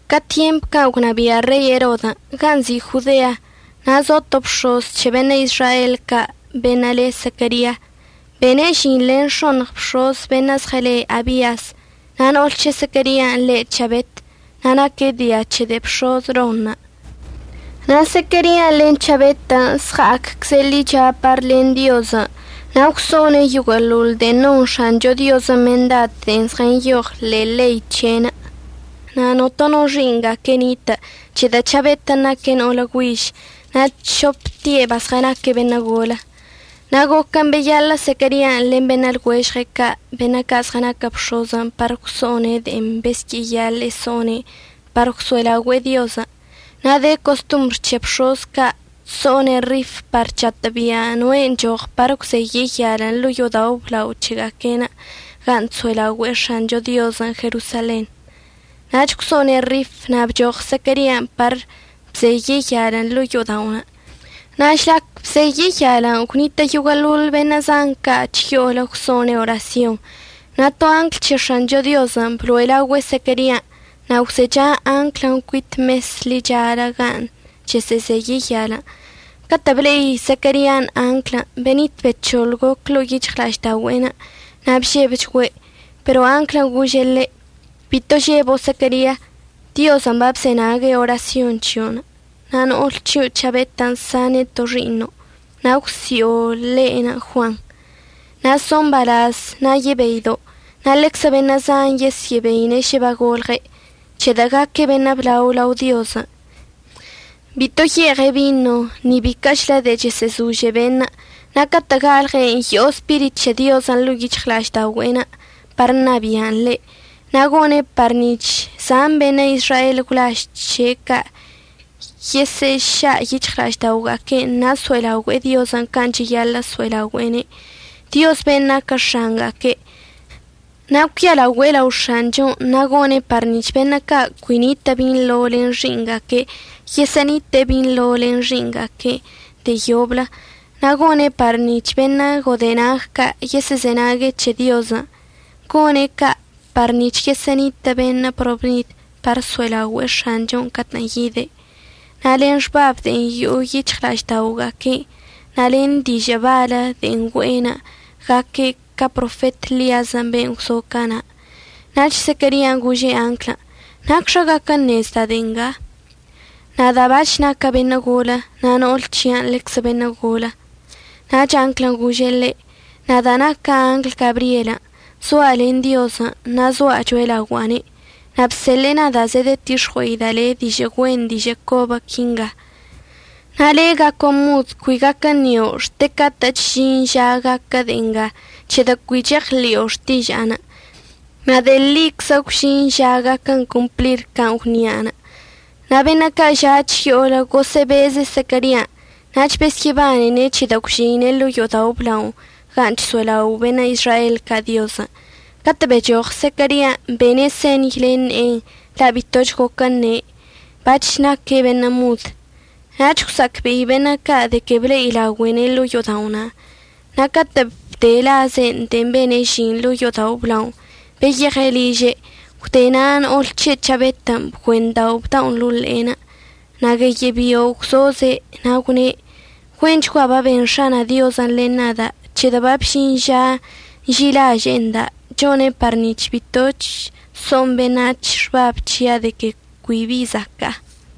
Ca tyemp can' gwnabia' Rei Erodən' gan' nzi' Jodea, na' zo to bx̱oz c̱he beṉə' Izrael ca' beṉə' le Zequeria. Bene' žin len x̱oṉɉ bx̱oz beṉə' zɉele Abias. Na' no'ol c̱he Zequerian' le' C̱habet na' naque' dia c̱he de'e bx̱oz Ronṉə'. Na' Zequerian' len C̱habetən' zɉa'accze' ḻicha par len Diozən', na' gwso'one' yoguə'əḻoḻ de'en non X̱ancho Diozən' mendad de'en zɉənyoɉ ḻe'e ḻei c̱he'enə'. Na' notono xi'iṉga'aque' nitə', c̱hedə' C̱habetən' naque' no'olə güiž, na' c̱hopte' bazɉənaque' beṉə' golə. Na' goquən' beyaḻə' Zequerian' len beṉə' lɉuežɉe' ca' beṉə' ca' zɉənaquə bx̱oz par gwso'one' de'en besyə'əyaḻe'e so'one' par gwso'elaogüe'e Diozən'. Na' de costombr c̱he bx̱oz ca' chso'one' rif par chatə'əbia' noe' əchoɉ par əgwzeye' yal ḻo'o yo'odao' əblao c̱hega'aque'enə' gan' chso'elaogüe'e X̱ancho Diozən' Jerosalenṉə'. Nach gwso'one' rif na' bchoɉ Zequerian' par bzeye' yalən' ḻo'o yo'oda'onə'. Na' žlac bzeye' yalən' gwnitə' yoguə'əḻoḻ beṉə' zan ca' chyo'olə gwso'one' orasyonṉə'. Na' to angl c̱he X̱ancho Diozən' bloe' laogüe' Zequerian', na' gwzecha anglən' cuit mesən' ḻichalə gan' chəsə'əzeye' yalən'. Catə' ble'i Zequerian' anglən' benit bec̱hoḻ goc ḻo'o yic̱hɉla'aždaogüe'enə' na' bžebchgüe'. Pero anglən' gože' ḻe': ―Bito žebo' Zequeria. Diozən' babzenague' orasyon c̱hio'onə', na' no'ol c̱hio' C̱habetən' sane' to xi'iṉo', na' əgwsi'o le' Juan. Na' so' mbalaz na' yebeido', na' ḻeczə beṉə' zan yesyə'əbeine' šə bagolɉe', c̱hedə' gaque' beṉə' blao lao Diozən'. Bito ye'eɉe' bino ni biquə'əchlə de'en chesə'əzože beṉə', na' catə' galɉe' yo'o Spirit c̱he Diozən' ḻo'o yic̱hɉla'aždaogüe'enə' par ṉabi'an ḻe'. Na' gone' par nic̱h zan beṉə' Izrael gwlaž c̱he' ca' yesə'əša' yic̱hɉla'ažda'oga'aque'enə' na' so'elaogüe'e Diozən' can' cheyaḻə' so'elaogüe'ene', Dioz ben' naquə X̱anga'aque'. Na' cuialaogüe' lao X̱anchon' na' gone' par nic̱h beṉə' ca' cui nitə' binḻo len xi'iṉga'aque' yesyə'ənite'e binḻo len xi'iṉga'aque' de'e yoblə. Na' gone' par nic̱h beṉə' godenag ca' yesə'əzenague' c̱he Diozən'. Gone' ca' par nic̱h yesə'ənitə' beṉə' probnid par əso'elaogüe'e X̱anchon' catə'ən yide'. Na' len xbab de'en yo'o yic̱hɉla'aždaogüe'enə' na' len dižə' balə de'en güe'enə' gaque' ca profet Ḻiazən' ben' gwzo cana'. Nach Zequerian' gože' anglən': ―¿Nacxa gaquə əṉezda' de'e nga? Nada' bac̱h naca' beṉə' golə na' no'ol c̱hia'anə' ḻeczə beṉə' golə. Nach anglən' gože' ḻe': ―Nada' naca' angl Gabryel. Zoa' len Diozən' na' zoa' cho'elaogua'ane'. Na' bseḻe'e nada' zedetix̱ɉue'ida' le' dižə' güen dižə' cobə quinga. Na' le' gaco' mod, cui gaquə əṉio' xte que catə'əch əžin ža gaquə de'e nga, c̱hedə' cui cheɉḻi'o xtiža'anə'. Na' de'e ḻiczə gwžin ža gaquə complir can' gwnia'anə'. Na' beṉə' ca' ža' chyo'olə gosə'əbeze' Zequerian', nach besyə'əbanene' c̱hedə' gwžeine' ḻo'o yo'odao' əblao gan' chso'elao' beṉə' Izrael ca' Diozən'. Catə' bechoɉ Zequerian', bene' señy len ne'enə' la' bitoch goquə əṉe'. Bac̱h naque' beṉə' mod. Nach gwsa'acbe'i beṉə' ca' de que ble'ida'ogüe'ene' ḻo'o yo'oda'onə'. Na' catə' bde laze'en de'en bene' žin ḻo'o yo'odao' əblaonə' beyeɉe' liže'. Gwde na', no'ol c̱he' C̱habetən' bgüendao' bda'onə' ḻo'o ḻe'enə' na' gueyə' bio' gwzoze'. Na' gwne': ―Güenchgua baben X̱ana' Diozən' len nada', c̱hedə' babžin ža nži'ilaže'e nda', chone' par nic̱h bitoch so'on beṉac̱hən' xbab c̱hia' de que cui bi zaca'a.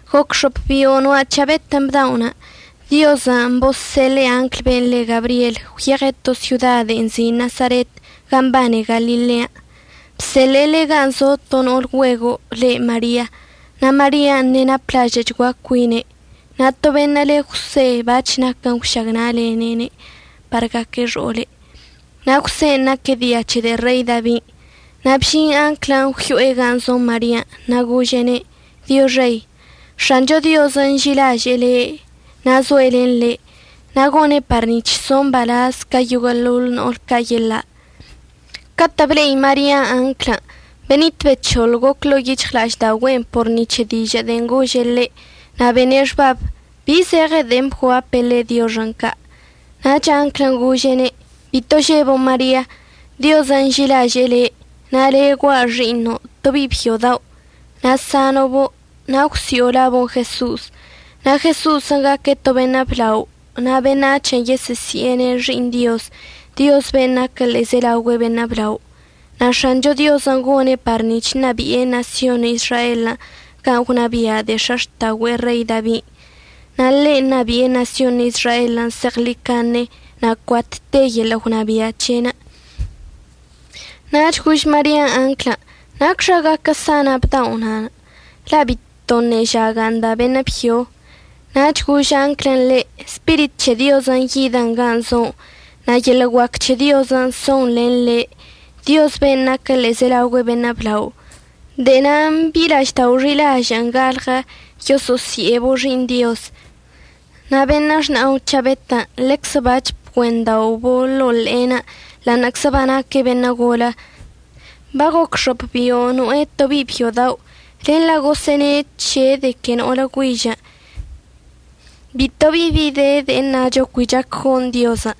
Goc x̱op bio' noa' C̱habetən' bda'onə', Diozən' bozseḻe'e anglən' ben' le Gabryel, gwyeɉe' to syoda de'en nzi' Nasaret gan' mbane Galilean'. Bseḻe'ene' gan' zo to no'ol güego' le' Maria. Na' Marian' ṉe'e naplažə'əchgua cuine'. Na' to beṉə' le Jwse bac̱h naquən gwšagna'alene' par gaque' xo'ole'. Na' Jwsen' naque' dia c̱he de'e Rei Dabin'. Na' bžin anglən' gwyo'e gan' zo Marian' na' gože'ene': ―Dioxei. X̱ancho Diozən' nži'ilaže'e le' na' zoe' len le'. Na' gone' par nic̱h socho' mbalaz ca yoguə'əḻoḻ no'ol ca' yeḻa'. Catə' ble'i Marian' anglən', benit bec̱hoḻ goc ḻo'o yic̱hɉla'aždaogüe'enə' por ni c̱he dižə' de'en gože' ḻe'. Na' bene' xbab bi zeɉen de'en bguape' ḻe' dioxən' ca'. Nach anglən' gože'ene': ―Bito žebo' Maria. Diozən' nži'ilaže'e le'. Na' le' gua' xi'iṉo', to bi'i byo dao', na' sano'obo', na' əgwsi'o labo' Jeso'os. Na' Jeso'osən' gaque' to beṉə' blao na' beṉac̱hən' yesə'əsi'ene' Xi'iṉ Dioz, Dioz ben' naquə ḻe'ezelaogüe beṉə' blao. Na' X̱ancho Diozən' gone' par nic̱h ṉabi'e ṉasyon Izraelən' can' gwnabia' de'e x̱axta'ogüe'e Rei Dabin'. Na' ḻe' ṉabi'e ṉasyon Izraelən' zeɉḻicaṉe. Na' cuat te yeḻə' gwnabia' c̱he'enə'. Nach gož Marian' anglən': ―¿Nacxa gaquə sana' bdao'? la' bitoṉə' žaga' nda' beṉə' byo. Nach gož anglən' ḻe': ―Spirit c̱he Diozən' yidən gan' zo'onə', na' yeḻə' guac c̱he Diozən' son len le', Dioz ben' naquə ḻe'ezelaogüe beṉə' blao. De'e na'anə' bi'i la'aždao' xi'ilažə'ən galɉənə', yoso'osi'ebo' Xi'iṉ Dioz. Na' beṉə' xna'o C̱habetən' ḻeczə bac̱h bgüenda'obo' ḻo'o ḻe'enə' ḻa'aṉə'əczə banaque' beṉə' golə. Bagoc x̱op bio' no'e to bi'i byo dao', len la' gosə'əne' c̱he' de que no'olə güižən'. Bito bi bi de de'e əṉacho cui chac gon Diozən'.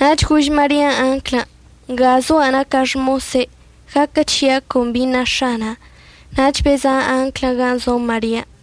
Nach gož Marian' anglən': ―Nga zoa' naca' xmose', gaquə c̱hia' con bi na X̱ana'an. Nach beza' anglən' gan' zo Marian'.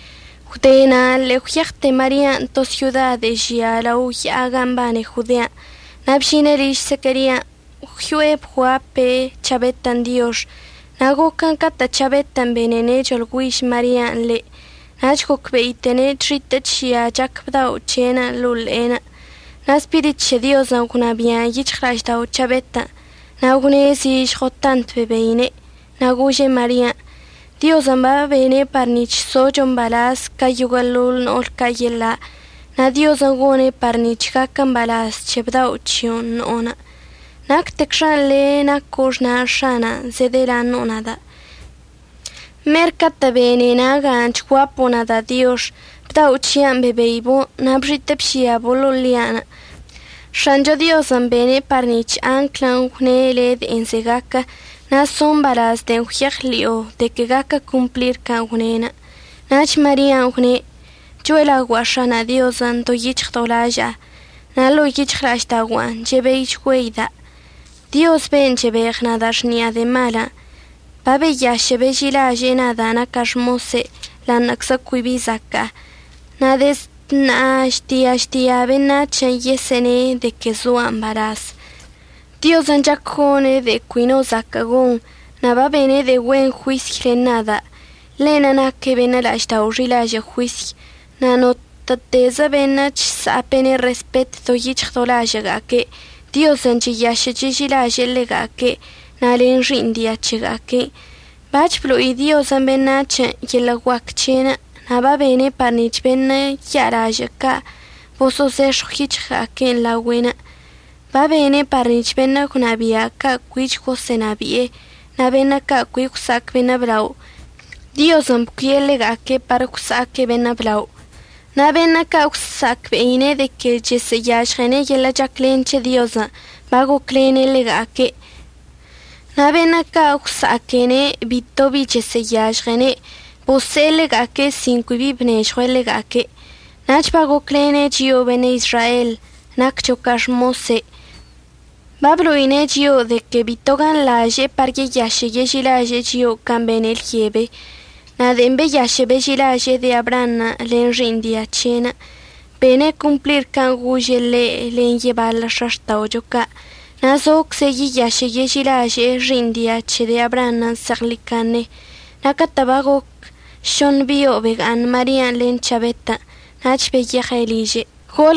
Gwde na' ḻe'e gwyeɉte Marian' to syoda de'e žia lao ya'a gan' mbane Jodean'. Na' bžine' liž Zequerian', gwyo'e bguape' C̱habetən' diox. Na' goquən' catə' C̱habetən' benene' choḻgüiž Marian' ḻe' nach gocbe'iteine' chxitə' chžia chac bdao' c̱he'enə' ḻo'o ḻe'enə'. Na' Spirit c̱he Diozən' gwnabi'an yic̱hɉla'aždao' C̱habetən'. Na' gwṉe' zižɉo tant bebeine', na' gože' Marian': ―Diozən' babene' par nic̱h zocho' mbalaz ca yoguə'əḻoḻ no'ol ca' yeḻa'. Na' Diozən' gone' par nic̱h gaquə mbalaz c̱he bdao' c̱hio'onə' no'onə'. Nactecxan' le' naco' xna' X̱ana'an zedəlaṉo'o nada'. Mer catə' bene naga'anə' chguapo' nada' dioxən', bdao' c̱hia'anə' bebeibo' na' bxitə' bžiabo' ḻo'o ḻi'anə'. X̱ancho Diozən' bene' par nic̱h anglən' gwne' le' de'en ze'e gaquə na' zo' mbalaz de'en gwyeɉḻi'o de que gaquə complir can' gwne'enə'. Nach Marian' gwne': ―Cho'elaogua'a X̱ana' Diozən' do yic̱hɉ do laža'a. Na' ḻo'o yic̱hɉla'aždaogua'an chebeichgüeida' Dioz ben' chebeɉ nada' xni'a de'e malən'. Babeyašə' beži'ilaže'e nada' naca' xmose' ḻa'aṉə'əczə cui bi zaca'a. Na' dezd ṉa'a žtia žtia beṉac̱hən' yesə'əne' de que zoa' mbalaz. Diozən' chac gone' de'e cui no zaquə gon, na' babene' de'e güen juisy len nada'. Ḻe'enə' naque' beṉə' la'aždao' xi'ilažə' juisy. Na' notə'ətezə beṉə' chsa'ape'ene' respet do yic̱hɉ do lažə'əga'aque', Diozən' cheyašə' cheži'ilaže'e ḻega'aque' na' len xi'iṉ dia c̱hega'aque'. Bac̱h blo'i Diozən' beṉac̱hən' yeḻə' guac c̱he'enə', na' babene' par nic̱h beṉə' ya'alažə' ca' baboso'ozex̱ɉw yic̱hɉga'aque'enə' laogüe'enə'. Babene' par nic̱h beṉə' gwnabia' ca' cuich gosə'ənabi'e, na' beṉə' ca' cui gwsa'ac beṉə' blao, Diozən' bcuie' ḻega'aque' par gwsa'aque' beṉə' blao. Na' beṉə' ca' gwsa'acbe'ine' de que chesə'əyažɉene' yeḻə' chaclen c̱he Diozən', bagoclene' ḻega'aque'. Na' beṉə' ca' gwsa'aquene' bitobi chesə'əyažɉene', bose'e ḻega'aque' sin cui bi bnežɉue' ḻega'aque'. Nach bagocwlene' chio'o beṉə' Izrael naccho ca xmose'. Bablo'ine' chio'o de que bito ganḻaže'e par yeyašə' yeži'ilaže'e chio'o can' bene' lyebe. Na' de'en beyašə' beži'ilaže'e de'e Abraanṉə' len xi'iṉ dia c̱he', bene' complir can' gože' ḻe' len yebaḻə x̱axta'ocho ca'. Na' zocze' yeyašə' yeži'ilaže'e xi'iṉ dia c̱he de'e Abraanṉə' zeɉḻicaṉe. Na' catə' bagoc šoṉ bio' bega'aṉ Marian' len C̱habetən' nach beyeɉe' liže'enə'.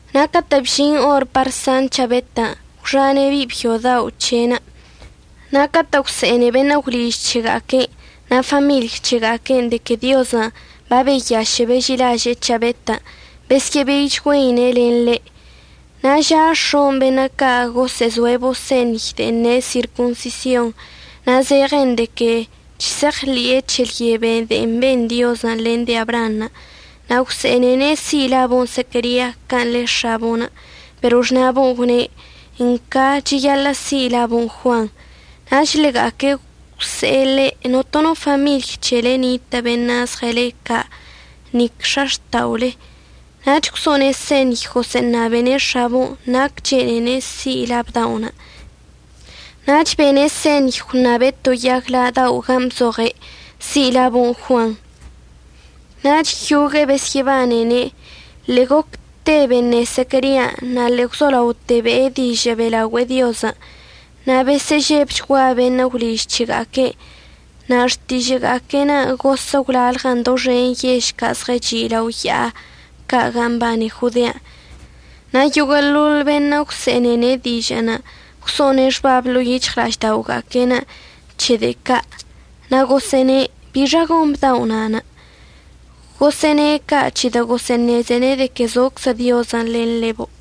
Na' catə' bžin or par san C̱habetən', gwxane' bi'i byo dao' c̱he'enə'. Na' catə' gwse'ene beṉə' gwliž c̱hega'aque'enə' na' famiḻy c̱hega'aque'enə' de que Diozən' babeyašə' beži'ilaže'e C̱habetən', besyə'əbeichgüeine' len ḻe'. Na' ža x̱on' beṉə' ca' ɉəsə'əzo'ebo' señy de'en ne' sirconsision. Na' zeɉen de que chse'eɉḻe'e c̱he lyebe de'en ben Diozən' len de'e Abraanṉə'. Na' gwse'enene' si' labo' Zequeria can' le x̱abo'onə'. Pero xna'abo'onə' gwne': ―Nca, cheyaḻə' si' labon' Juan. Nach ḻega'aque' gwse'e ḻe': ―Notono famiḻy c̱hele nitə' beṉə' zɉəle ca' na' nic x̱axta'ole. Nach gwso'one' señy gosə'əṉabene' x̱abo'onə' nac chene'ene' si' la bda'onə'. Nach bene' señy gwṉabe' to yag la' dao' gan' bzoɉe': “Si' labo' Juan.” Nach yogue'e besyə'əbanene'. Ḻe'e gocte beṉe Zequerian' na' ḻe'e gwzolaote be'e dižə' be'elaogüe'e Diozən'. Na' besə'əžebchgua beṉə' gwliž c̱hega'aque'enə'. Na' xtižə'əga'aque'enə' gosə' gwlalɉən doxen yež ca' zɉəchi' lao ya'a ca' gan' mbane Jodean'. Na' yoguə'əḻoḻ beṉə' gwse'enene' dižə'ənə' gwso'one' xbab ḻo'o yic̱hɉla'ažda'oga'aque'enə' c̱he de'e ca', na' gosə'əne': ―¿Bixa gon bdao' na'anə'? Gosə'əne' ca' c̱hedə' gosə'əṉezene' de que zoczə Diozən' len ḻebo'.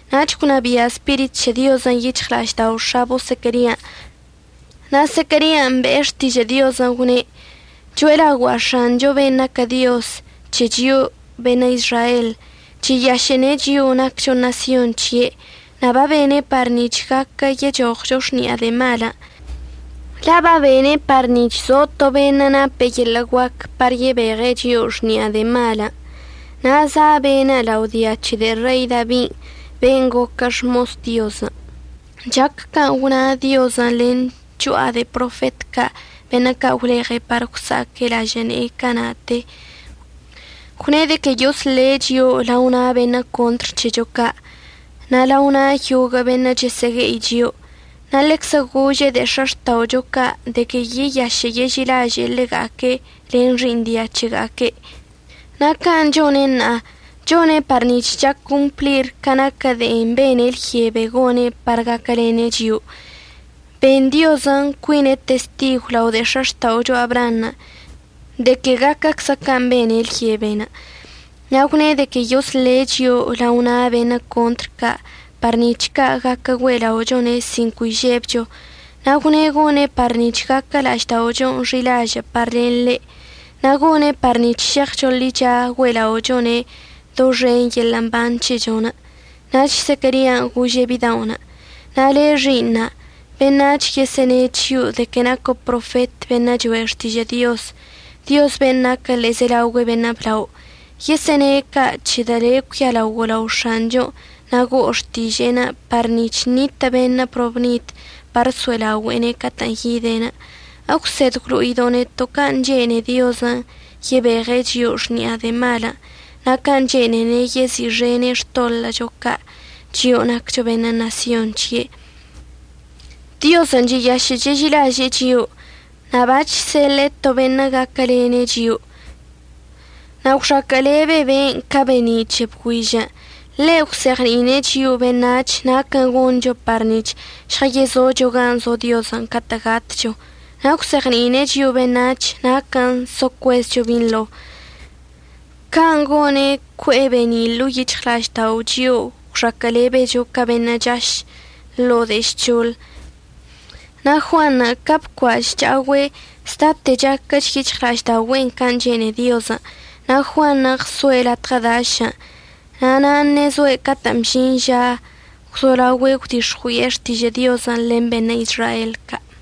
Nach gwnabia' Spirit c̱he Diozən' yic̱hɉla'aždao' x̱abo' Zequerian'. Na' Zequerian' be'e xtižə' Diozən' gwne': Cho'elaogua'a X̱anchon' ben' naquə Dioz c̱he chio'o beṉə' Izrael. Cheyaše'ene' chio'o naccho ṉasyon' c̱he' na' babene' par nic̱h gaquə yechoɉcho xni'a de'e malən'. La' babene' par nic̱h zo to beṉə' napə yeḻə' guac par yebeɉe' chio'o xni'a de'e malən', na' za' be'enə' lao dia c̱he de'e Rei Dabin' ben' goquə xmos Diozən'. Chac can' gwna Diozən' len cho'a de'e profet ca' beṉə' ca' gwleɉe' par gwsa'aque' lažə' ne'enə' cana'ate. Gwne' de que yosle' chio'o lao na' beṉə' contr c̱hecho ca' na' lao na' yoguə' beṉə' chəsə'əgue'i chio'o. Na' ḻeczə gože' de'e x̱axta'ocho ca' de que yeyašə' yeži'ilaže'e ḻega'aque' len xi'iṉ dia c̱hega'aque'. Na' can' chone' ṉa'a, chone' par nic̱h chac complir ca naquə de'en bene' lyebe gone' par gaquəlene' chio'o. Ben Diozən' cuine' testigw lao de'e x̱axta'ocho Abraanṉə' de que gaquəczə can' bene' lyeben'. Na' gwne' de que yosle' chio'o lao na' beṉə' contr ca' par nic̱h ca' gaquə güe'ela'ochone' sin cui žebcho. Na' gwne' gone' par nic̱h gaquə la'ažda'ochon' xi'ilažə' par len ḻe'enə' na' gone' par nic̱h šeɉcho ḻicha güe'ela'ochone' doxen yeḻə' mban c̱hechon'. Nach Zequerian' gože' bida'onə': Na' le' xi'iṉa', beṉac̱hən' yesə'əne' c̱hio' de que naco' profet beṉə' choe' xtižə' Diozən', Dioz ben' naquə ḻe'ezelaogüe beṉə' blao. Yesə'əne' ca' c̱hedə' le' cuialaogo' lao X̱anchon' na' go'o xtiže'enə' par nic̱h ṉitə' beṉə' probnid par əso'elaogüe'ene' catə'ən yide'. Egwsed əgwlo'ido' neto' can' chene'e Diozən' yebeɉe' chio'o xni'a de'e malən' na' can' chene'ene' yezi'ixene' xtoḻə'əcho ca', chio'o naccho beṉə' ṉasyon c̱he'. Diozən' cheyašə' cheži'ilaže'e chio'o na' bachseḻe'e to beṉə' gaquəlene' chio'o. Na' gwxaquə'əlebe be'enə' ca be'eni' c̱he bgüižən'. Ḻe' gwzeɉni'ine' chio'o beṉac̱h naquən' goncho par nic̱h žɉəyezocho gan' zo Diozən' catə' gatcho, na' əgwzeɉni'ine' chio'o beṉac̱h naquən' so cuezcho binḻo. Can' gone' cue'e be'eni' ḻo'o yic̱hɉla'aždao' chio'o gwxaquə'əlebecho ca beṉə' chsa'aš ḻo'o de'e žc̱hoḻən'. Na' Juanṉə' ca bcua' chcha'ogüe', zdate chaquəch yic̱hɉla'aždaogüe'en can' chene'e Diozən'. Na' Juanṉə' ɉsoe' latɉə dašən'. Na' nan' ṉezoe' catə'ən bžin ža gwzolaogüe' gwdix̱ɉui'e xtižə' Diozən' len beṉə' Izrael ca'.